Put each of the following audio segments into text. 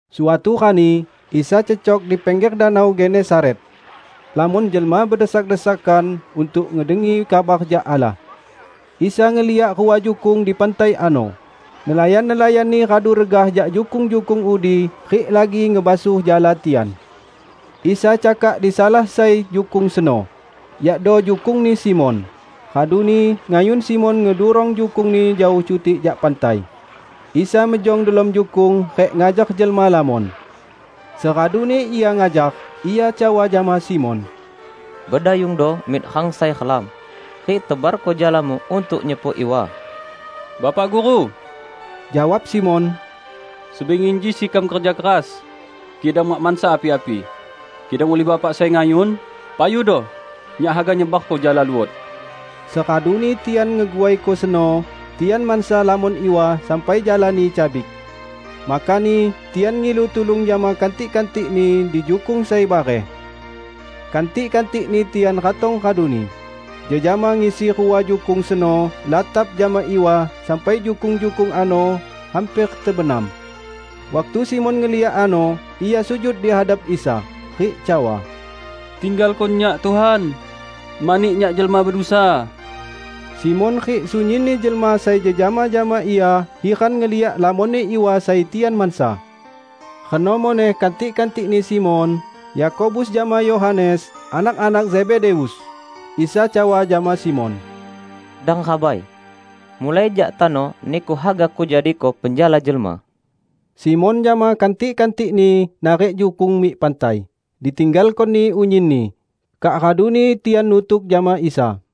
Suatu rani, Isa cecok dipingger Danau Genesaret. Lamon jelma bedesak-desakan untuk ngedengi kabar jak Allah. Isa ngeliak rua jukung di pantai ano; nelayan-nelayanni radu regah jak jukung-jukung udi rik lagi ngebasuh jala tian. Isa cakak disalah sai jukung seno, yakdo jukungni Simon, raduni ngayun Simon ngedurong jukungni jaoh cutik jak pantai. Isa mejong delom jukung rik ngajar jelma lamon. Seraduni Ia ngajar, Ia cawa jama Simon, "Bedayungdo mik rang sai relam, rik tebarko jalamu untuk nyepok iwa." "Bapa Guru," jawab Simon, "sebingi inji sekam kerja keras, kidang mak mansa api-api! Kidang ulih Bapak sai ngayun, payudo; nyak haga nyebarko jala luot." Seraduni tian ngeguaiko seno, tian mansa lamon iwa sampai jalani cabik. Makani tian ngilu tulung jama kantik-kantikni di jukung sai bareh. Kantik-kantikni tian ratong raduni, jejama ngisi rua jukung seno latap jama iwa sampai jukung-jukung ano hamper tebenam. Waktu Simon ngeliak ano, ia sujud di hadap Isa, rik cawa, "Tinggalko nyak, Tuhan! Mani nyak jelma bedusa!" Simon rik sunyinni jelma sai jejama jama ia hiran ngeliak lamonni iwa sai tian mansa. Reno muneh kantik-kantikni Simon, Yakobus jama Yohanes, anak-anak Zebedeus. Isa cawa jama Simon, "Dang rabai! Mulai jak tano niku haga kujadiko penjala jelma." Simon jama kantik-kantikni narik jukung mik pantai, ditinggalkoni unyinni, kak raduni tian nutuk jama Isa.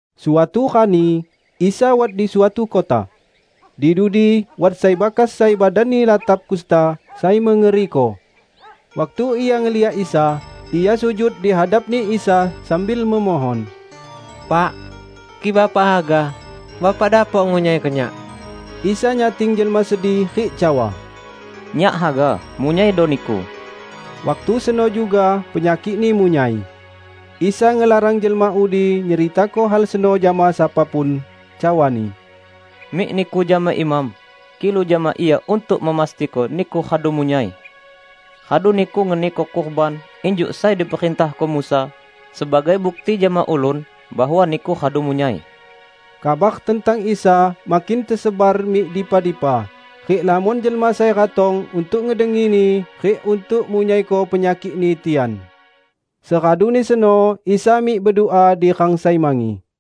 Suatu rani, Isa wat di suatu kota. Di dudi wat sai bakas sai badanni latap kusta sai mengeriko. Waktu ia ngeliak Isa, ia sujud dihadapni Isa sambil memohon, "Pak, kik Bapak haga, Bapak dapok ngunyaiko nyak!" Isa nyating jelma sedi rik cawa, "Nyak haga, munyaido niku!" Waktu seno juga penyakikni munyai. Isa ngelarang jelma udi nyeritako hal seno jama sapa pun, cawa-Ni, "Mik niku jama imam, kilu jama ia untuk memastiko niku radu munyai. Radu niku ngeniko kurban injuk sai diperintahko Musa, sebagai bukti jama ulun bahwa niku radu munyai." Kabar tentang Isa makin tesebar mik dipa-dipa, rik lamon jelma sai ratong untuk ngedengi-Ni rik untuk munyaiko penyakikni tian. Seraduni seno Isa mik bedua di rang sai mangi.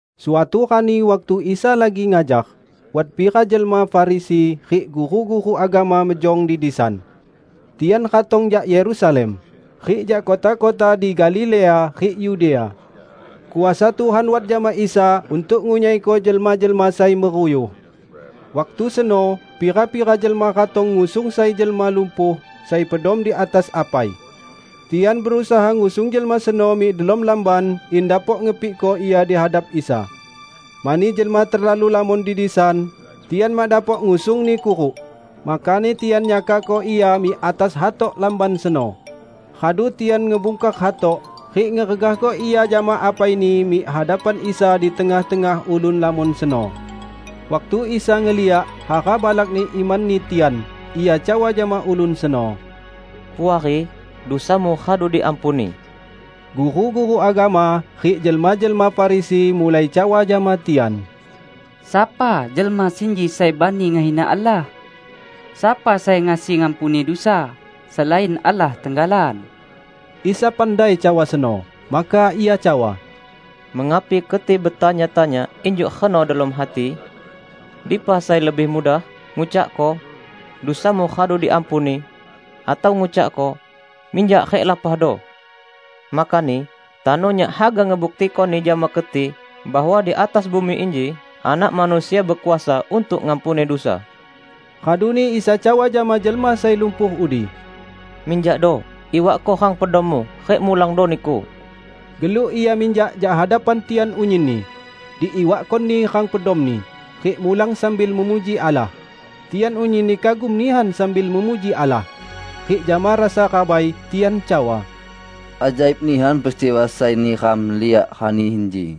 Suatu rani waktu Isa lagi ngajar, wat pira jelma Farisi rik guru-guru agama mejong di disan. Tian ratong jak Yerusalem, rik jak kota-kota di Galilea rik Yudea. Kuasa Tuhan wat jama Isa untuk ngunyaiko jelma-jelma sai meruyuh. Waktu seno pira-pira jelma ratong ngusung sai jelma lumpuh sai pedom di atas apai. Tian berusaha ngusung jelma seno mik delom lamban in dapok ngepikko ia di hadap Isa. Mani jelma terlalu lamon di disan, tian mak dapok ngusungni kuruk. Makani tian nyakakko ia mik atas hatok lamban seno, radu tian ngebungkar hatok, rik ngeregahko ia jama apaini mik hadapan Isa di tengah-tengah ulun lamon seno. Waktu Isa ngeliak hara balakni imanni tian, Ia cawa jama ulun seno, "Puari, dusamu radu diampuni." Guru-guru agama rik jelma-jelma Farisi mulai cawa jama tian, "Sapa jelma sinji sai bani ngehina Allah? Sapa sai ngasi ngampuni dusa, selain Allah tenggalan?" Isa pandai cawa seno. Maka Ia cawa, "Mengapi keti betanya-tanya injuk reno delom hati? Dipa sai lebih mudah, ngucakko, 'Dusamu radu diampuni', atau ngucakko, 'Minjak rik lapahdo!'? Makani tano Nyak haga ngebuktikoni jama keti bahwa di atas bumi inji Anak Manusia bekuasa untuk ngampuni dusa." Raduni Isa cawa jama jelma sai lumpuh udi, "Minjakdo, iwakko rang pedommu, rik mulangdo niku!" Geluk ia minjak jak hadapan tian unyinni, diiwakkoni rang pedomni, rik mulang sambil memuji Allah. Tian unyinni kagum nihan sambil memuji Allah. Rik jama rasa rabai, tian cawa, "Ajaib nihan peristiwa sai neram liak rani inji!"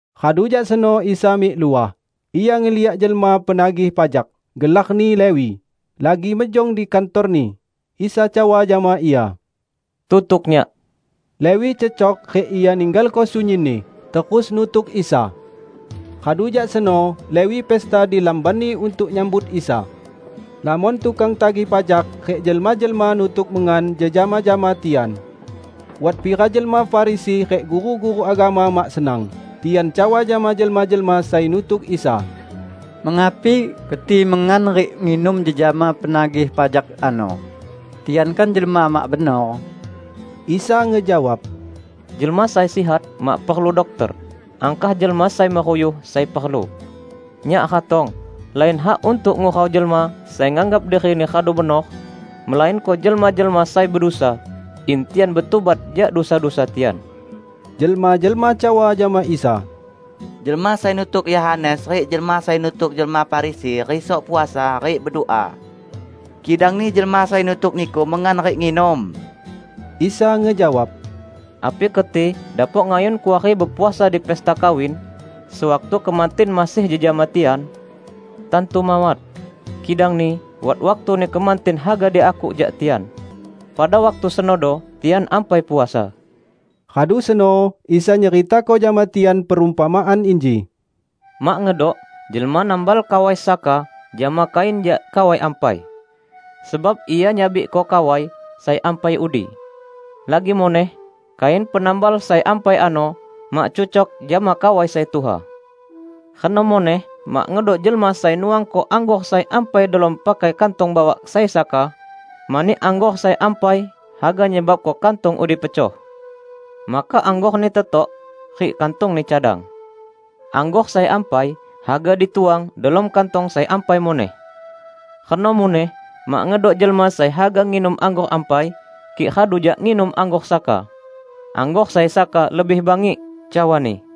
Radu jak seno Isa mik luah, Ia ngeliak jelma penagih pajak, gelarni Lewi, lagi mejong di kantorni. Isa cawa jama ia, "Tutuk Nyak." Lewi cecok rik ia ninggalko sunyinni, terus nutuk Isa. Radu jak seno Lewi pesta di lambanni untuk nyambut Isa. Lamon tukang tagih pajak rik jelma-jelma nutuk mengan jejama jama tian. Wat pira jelma Farisi rik guru-guru agama mak senang, tian cawa jama jelma-jelma sai nutuk Isa, "Mengapi keti mengan rik nginum jejama penagih pajak ano, tian kan jelma mak benor?" Isa ngejawab, "Jelma sai sihat mak perlu dokter, angkah jelma sai meruyuh sai perlu. Nyak ratong lain hak untuk ngurau jelma sai nganggap dirini radu benor, melainko jelma-jelma sai bedusa in tian betubat jak dusa-dusa tian." Jelma-jelma cawa jama Isa, "Jelma sai nutuk Yohanes rik jelma sai nutuk jelma Farisi risok puasa rik bedua. Kidangni jelma sai nutuk Niku mengan rik nginum." Isa ngejawab, "Api keti dapok ngayun kuari bepuasa di pesta kawin, sewaktu kemantin masih jejama tian? Tantu mawat! Kidangni wat waktuni kemantin haga diakuk jak tian. Pada waktu senodo tian ampai puasa." Radu seno Isa nyeritako jama tian perumpamaan inji, "Mak ngedok jelma nambal kawai saka jama kain jak kawai ampai. Sebab ia nyabikko kawai sai ampai udi. Lagi muneh kain penambal sai ampai ano mak cucok jama kawai sai tuha. Reno muneh mak ngedok jelma sai nuangko anggor sai ampai delom pakai kantong bawak sai saka, mani anggor sai ampai haga nyebabko kantong udi pecoh. Maka anggorni tetok, rik kantongni cadang. Anggor sai ampai, haga dituang delom kantong sai ampai muneh. Reno muneh mak ngedok jelma sai haga nginum anggor ampai kik radu jak nginum anggor saka. 'Anggor sai saka lebih bangik,' cawani."